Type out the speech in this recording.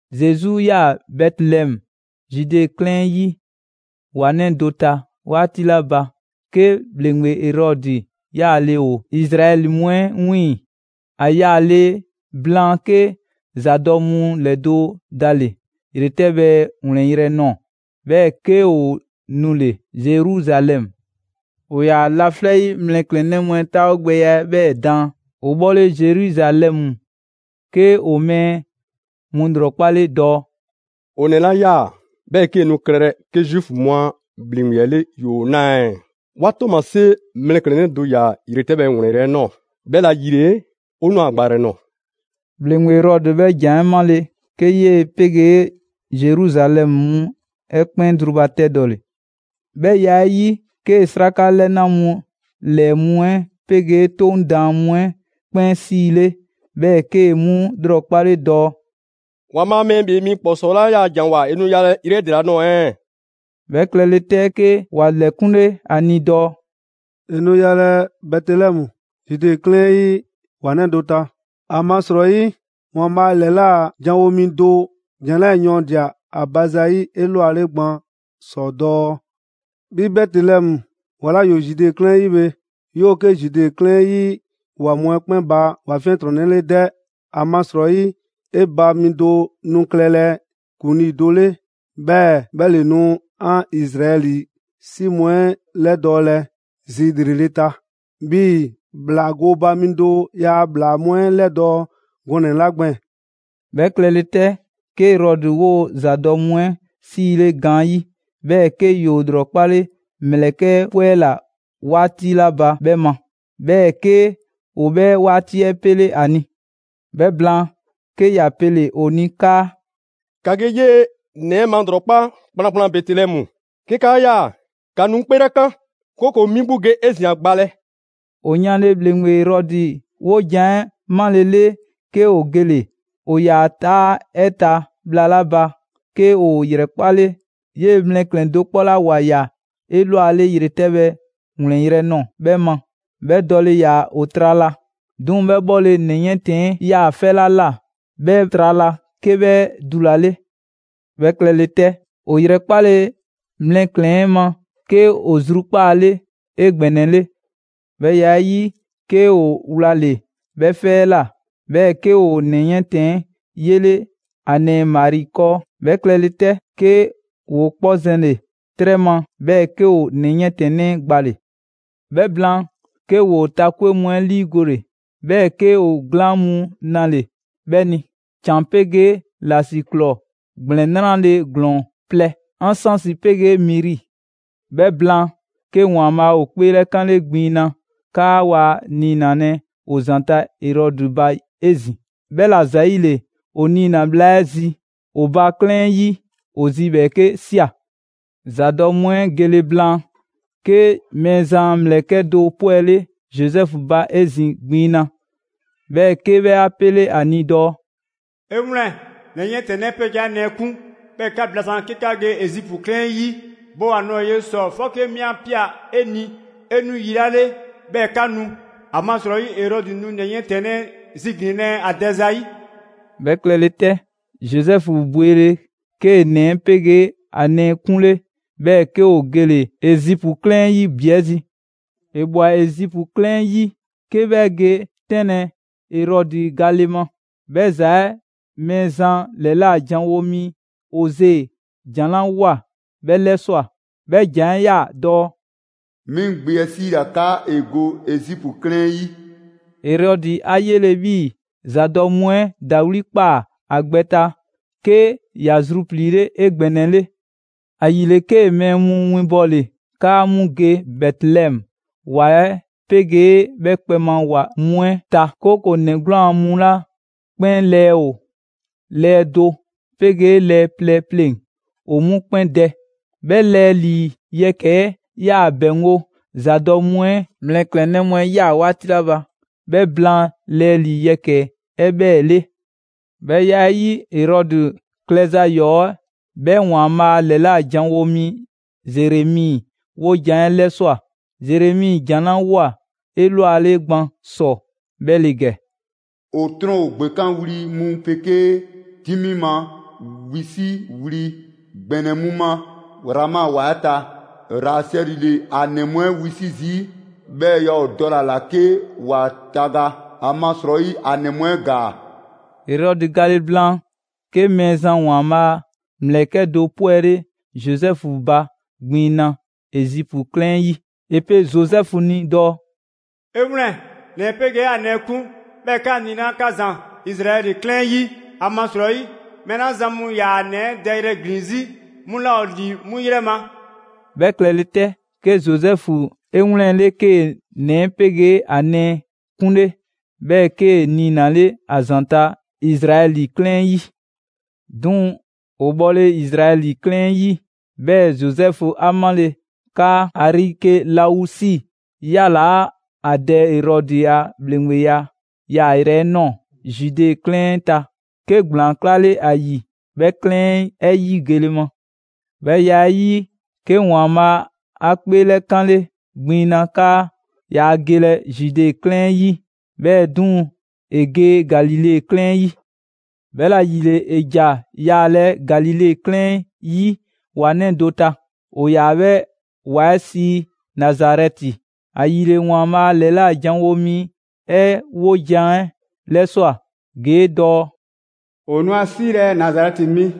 Zesu ꞊yaa Bɛtelɛmu, Zude 'klɛɛn 'ɛ 'yi ‑wa 'nɛ do ta 'waati 'la ba, 'ke ‑bhleŋgbe Erɔdi 'yaale‑ ‑o Izraɛli mu 'ɛ 'wiiŋ‑. ‑A yale blaan, 'ke ‑zadɔ' mu ‑lɛdo' dale‑ ‑yretɛbhɛ ‑wlɛnyrɛ' ꞊nɔɔ, 'bhɛɛ‑ 'ke ‑o nule‑ Zeruzalɛmu. ‑O ‑yaa laflɛ' 'yi mlɛklɛnnɛ mu 'ɛ 'taawogbɛya 'ɛ 'bhɛɛ‑ daan. ‑O bhɔle Zeruzalɛmu, 'ke ‑o mɛɛ mu ‑lrɔkpale dɔɔ: «‑O ‑nɛ 'la 'yaa‑ 'bhɛɛ‑ 'kee‑ nu klɛlɛ 'ke Zuufu mu a ‑bhleŋgbe 'le ‑yoo 'naa ɛɛ? 'Wa ‑tɔɔmasie mlɛklɛnnɛ do ‑ya ‑yretɛbhɛ ‑wlɛnyrɛ' ꞊nɔɔ, 'bhɛla‑ ‑yile 'o ꞊nwa ‑a gbayrɛ nɔɔ‑.» ‑Bhleŋgbe Erɔdi 'bhɛ ‑jan 'ɛ 'male‑, 'ke 'yee‑ 'pegee Zeruzalɛmu mu 'ɛ 'kpɛn zrubatɛdɔle. 'Bhɛ ya 'ɛ 'yi, 'kee‑ 'sraka 'lɛna mu ‑lɛɛ mu 'ɛ 'pegee 'Toŋ daan mu 'ɛ 'kpɛn 'siile, 'bhɛɛ‑ 'kee‑ 'mu ‑lrɔkpale dɔɔ: «‑Waanbhaa' Mɛɛ ‑Bhee Mi ‑Kpɔsɔɔ 'la ‑yaa' ‑janwoa, ‑e nu yalɛ yrɛ 'ɛ ‑dela nɔɔ‑ ɛɛ?» 'Bhɛ klɛle 'tɛ, 'ke ‑wa ‑lɛkunle ‑a ni dɔɔ: «‑E nu yalɛ Bɛtelɛmu, Zude 'klɛɛn 'ɛ 'yi ‑wa 'nɛ do ta. ‑Amasrɔyi ‑Waanbhaa' ‑lɛla' janwo mi do ‑jan 'lɛɛ‑ yɔɔndia‑ ‑a ba zayi' 'elwale gban ‑sɔ dɔɔ: ‹'Bhi Bɛtelɛmu ‑wa 'la ‑yoo Zude 'klɛɛn 'ɛ 'yi bhe! 'Yoo‑ 'ke Zude 'klɛɛn 'ɛ 'yi ‑wa mu 'ɛ 'kpɛn ba ‑wa 'fiɛntrɔnnɛ 'le 'dɛ! ‑Amasrɔyi 'e ba mi do nu klɛlɛ ‑kuŋlii do 'le, 'bhɛɛ‑ 'bhɛ ‑le nu 'an Izraɛli 'si mu 'ɛ 'lɛdɔɔlɛ zi ‑lrele' ta 'bhii‑ ‑bhlaa gooba mi do ‑yaa' ‑bhlaa mu 'ɛ 'lɛdɔɔ‑ gɔnɛ‑ 'la gbɛɛn‑.›» 'Bhɛ klɛle 'tɛ, 'ke Erɔdi 'woo‑ ‑zadɔ' mu 'ɛ 'siile gaanyi', 'bhɛɛ‑ 'ke ‑yoo ‑lrɔkpale mlɛklɛn‑ 'ɛ 'pwɛla‑ 'waati 'la ba 'bhɛ ma. 'Bhɛɛ‑ 'ke ‑o 'bhɛ 'waati 'ɛ 'pele 'a ni. 'Bhɛ blaan, 'ke ‑ya pele‑ ‑o ni 'kaa: «‑Ka ge 'yee‑ ‑nɛ 'ɛ malrɔkpa kplankplan Bɛtelɛmu; 'ke 'kaa ꞊ya, ‑ka nu 'ŋ 'kpeelɛkan, 'kooko‑ 'mi 'gbu ge 'ezin‑ ‑a gbalɛ.» ‑O yanle ‑bhleŋgbe Erɔdi 'wojan‑ 'ɛ malele, 'ke ‑o gele‑. ‑O ‑yaa 'taa 'ɛ ta bhla 'la ba, 'ke ‑o ‑yrɛkpale 'yee‑ mlɛklɛn‑ do 'kpɔ 'la ‑wa ꞊ya 'elwale ‑yretɛbhɛ ‑wlɛnyrɛ' ꞊nɔɔ 'bhɛ ma. 'Bhɛ dɔle ‑yaa ‑o trala. 'Duŋ‑ 'bhɛ 'bhɔle‑ ‑nɛ 'yiɛntɛnnɛ 'ɛ 'yaa‑ 'fɛ 'la ꞊la 'bhɛ trala, 'ke 'bhɛ dulale. 'Bhɛ klɛle 'tɛ, ‑o ‑yrɛkpale mlɛklɛn‑ 'ɛ ma 'ke ‑o zru 'kpaale 'egbɛnɛle. 'Bhɛ ya 'ɛ 'yi, 'ke ‑o wlale‑ 'bhɛ 'fɛ 'ɛ ꞊la, 'bhɛɛ‑ 'ke ‑o ‑nɛ 'yiɛntɛnnɛ 'ɛ 'yele ‑a nɛɛ Mari 'kɔɔ. 'Bhɛ klɛle 'tɛ, 'ke ‑woo 'kpɔ zɛnle‑ 'trɛ ma, 'bhɛɛ‑ 'ke ‑o ‑nɛ 'yiɛntɛnnɛ 'ɛ gbale‑. 'Bhɛ blaan, 'ke ‑woo ta 'kwe mu 'ɛ 'liigole, 'bhɛɛ‑ 'ke ‑o glaan' mu 'nale‑ 'bhɛ ni: ‑Can 'pegee ‑lasiklɔɔ ‑gblɛn 'nrale‑ ‑glɔɔn plɛ: ansansi 'pegee miri. 'Bhɛ blaan, 'ke ‑Waanbhaa' ‑o 'kpeelɛkanle gbiŋ na 'kaa waa niinalɛ ‑o ‑zanta' Erɔdi ba 'ezin‑. 'Bhɛla ‑zayile, ‑o niina‑ bhla 'ɛ zi ‑o ba 'klɛɛn 'ɛ 'yi, ‑o zi ‑bhɛɛke' ꞊sia. ‑Zadɔ' mu 'ɛ gele blaan, 'ke Mɛɛzan a ‑mlɛkɛ' do 'pwɛle‑ Zozɛfu ba 'ezin‑ gbiŋ na, 'bhɛɛ‑ 'ke 'bhɛ 'a 'pele ‑a ni dɔɔ: «'E 'wlɛn‑, ‑nɛ 'yiɛntɛnnɛ 'ɛ 'pegee ‑a nɛɛ 'kun, 'bhɛɛ‑ ‑ka blasaan‑ 'ke 'ka ge Ezipu 'klɛɛn 'ɛ 'yi; bo ‑a ꞊nɔɔ ye ‑sɔ 'fɔke 'mi 'a ꞊pia 'e ni 'e nu yi 'la 'le, 'bhɛɛ‑ 'ka nu. ‑Amasrɔyi Erɔdi nu ‑nɛ 'yiɛntɛnnɛ 'ɛ ziglinlɛ ‑a dɛ zayi'.» 'Bhɛ klɛle 'tɛ, Zozɛfu bwele‑, 'kee‑ ‑nɛ 'ɛ 'pegee ‑a nɛɛ 'kunle, 'bhɛɛ‑ 'ke ‑o gele‑ Ezipu 'klɛɛn 'ɛ 'yi ‑bi 'ɛ zi. ‑E ꞊bwa Ezipu 'klɛɛn 'ɛ 'yi, 'ke 'bhɛ ge 'tɛnlɛ‑ Erɔdi gale ma. 'Bhɛ ‑za 'ɛ Mɛɛzan ‑lɛla' janwo mi Oze ‑jan 'la ꞊woa 'bhɛ 'lɛswa꞊. 'Bhɛ ‑jan 'ɛ 'yaa‑ dɔɔ: «'Mi 'ŋ gbe 'ɛ 'siila‑ 'kaa ‑e go Ezipu 'klɛɛn 'ɛ 'yi.» Erɔdi 'a 'yele 'bhii‑ ‑zadɔ' mu 'ɛ ‑dawli' ꞊kpaa ‑a gbɛ ta, 'ke ‑ya zrupliile 'egbɛnɛle. ‑Ayile 'kee‑ mɛɛ mu winbɔle 'kaa 'mu ge Bɛtelɛmu ‑wa 'ɛ 'pegee 'bhɛ kpɛ ma ‑wa mu 'ɛ ta, 'kooko‑ ‑nɛ 'gwlaan‑ mu 'la 'kpɛn lɛɛ ‑o lɛɛ do 'pegee lɛɛ plɛ pleŋ‑ ‑o 'mu 'kpɛn dɛ. 'Bhɛ lɛɛ ‑lii yɛkɛ‑ 'ɛ 'yaa‑ ‑bɛŋgo' ‑zadɔ' mu 'ɛ mlɛklɛnnɛ mu 'ɛ ꞊ya 'waati 'la ba 'bhɛ blaan lɛɛ ‑lii yɛkɛ‑ 'ɛ 'bhɛɛ‑ 'le. 'Bhɛ ya 'ɛ 'yi, Erɔdi klɛza ‑yɔɔ 'ɛ 'bhɛ ‑Waanbhaa' ‑lɛla' janwo mi Zeremi 'wojan‑ 'ɛ 'lɛswa꞊. Zeremi ‑jan 'la ꞊woa 'elwale gban ‑sɔ 'bhɛ ‑le ‑gɛ: «'O 'trɔn ‑o ‑gbekanwli mu 'pegee 'dimi ma wisiwli ‑gbɛnɛ mu ma Rama ‑wa 'ɛ ta. Rasɛli ‑le ‑a ‑nɛ mu 'ɛ wisi' zii', 'bhɛɛ‑ yaa ‑o dɔle‑ ‑a ‑la 'ke ‑wa taga; ‑amasrɔyi ‑a ‑nɛ mu 'ɛ ‑gaa.» Erɔdi gale blaan, 'ke Mɛɛzan ‑Waanbhaa' a ‑mlɛkɛ' do 'pwɛle Zozɛfu ba gbiŋ na Ezipu 'klɛɛn 'ɛ 'yi. ‑E pe Zozɛfu ni dɔɔ: «'E 'wlɛn‑, ‑nɛ 'ɛ 'pegee ‑a nɛɛ 'kun, 'bhɛɛ‑ 'ka niina‑ 'ka ‑zan Izraɛli 'ɛ 'klɛɛn 'yi, ‑amasrɔyi mɛɛ 'la zan mu ‑yaa ‑nɛ 'ɛ dɛyrɛ ‑glin 'zi, 'mu 'laa ‑o ‑li 'mu 'yrɛ ma.» 'Bhɛ klɛle 'tɛ, 'ke Zozɛfu 'e 'wlɛnle‑, 'kee‑ ‑nɛ 'ɛ 'pegee ‑a nɛɛ 'kunle, 'bhɛɛ‑ 'kee‑ niinale ‑a ‑zanta' Izraɛli 'klɛɛn 'ɛ 'yi. 'Duŋ‑ ‑o bhɔle Izraɛli 'klɛɛn 'ɛ 'yi; 'bhɛɛ‑ Zozɛfu 'a 'male‑ 'kaa Arikelausi ‑yalaa' ‑a dɛ Erɔdi a ‑bhleŋgbeya yaayrɛ 'ɛ ꞊nɔɔ Zude 'klɛɛn 'ɛ ta, 'ke ‑gblaan 'klale ‑a ‑yi 'bhɛ 'klɛɛn 'ɛ 'yi gele ma. 'Bhɛ ya 'ɛ 'yi, 'ke ‑Waanbhaa' 'a 'kpeelɛkanle gbiŋ na 'kaa yaa gelɛ Zude 'klɛɛn 'ɛ 'yi, 'bhɛɛ‑ 'duŋ‑ ‑e ge Galile 'klɛɛn 'ɛ 'yi. 'Bhɛla‑ ‑yile, ‑e ‑ja yaalɛ Galile 'klɛɛn 'yi ‑wa 'nɛ do ta: ‑O ‑yaa 'bhɛ ‑wa 'ɛ sii Nazarɛti. ‑Ayile, ‑Waanbhaa' ‑lɛla' ‑janwo' mi 'ɛ 'wojan‑ 'ɛ 'lɛswa꞊ ‑gee' dɔɔ: «‑O nu a 'siilɛ‑ Nazarɛti mi.»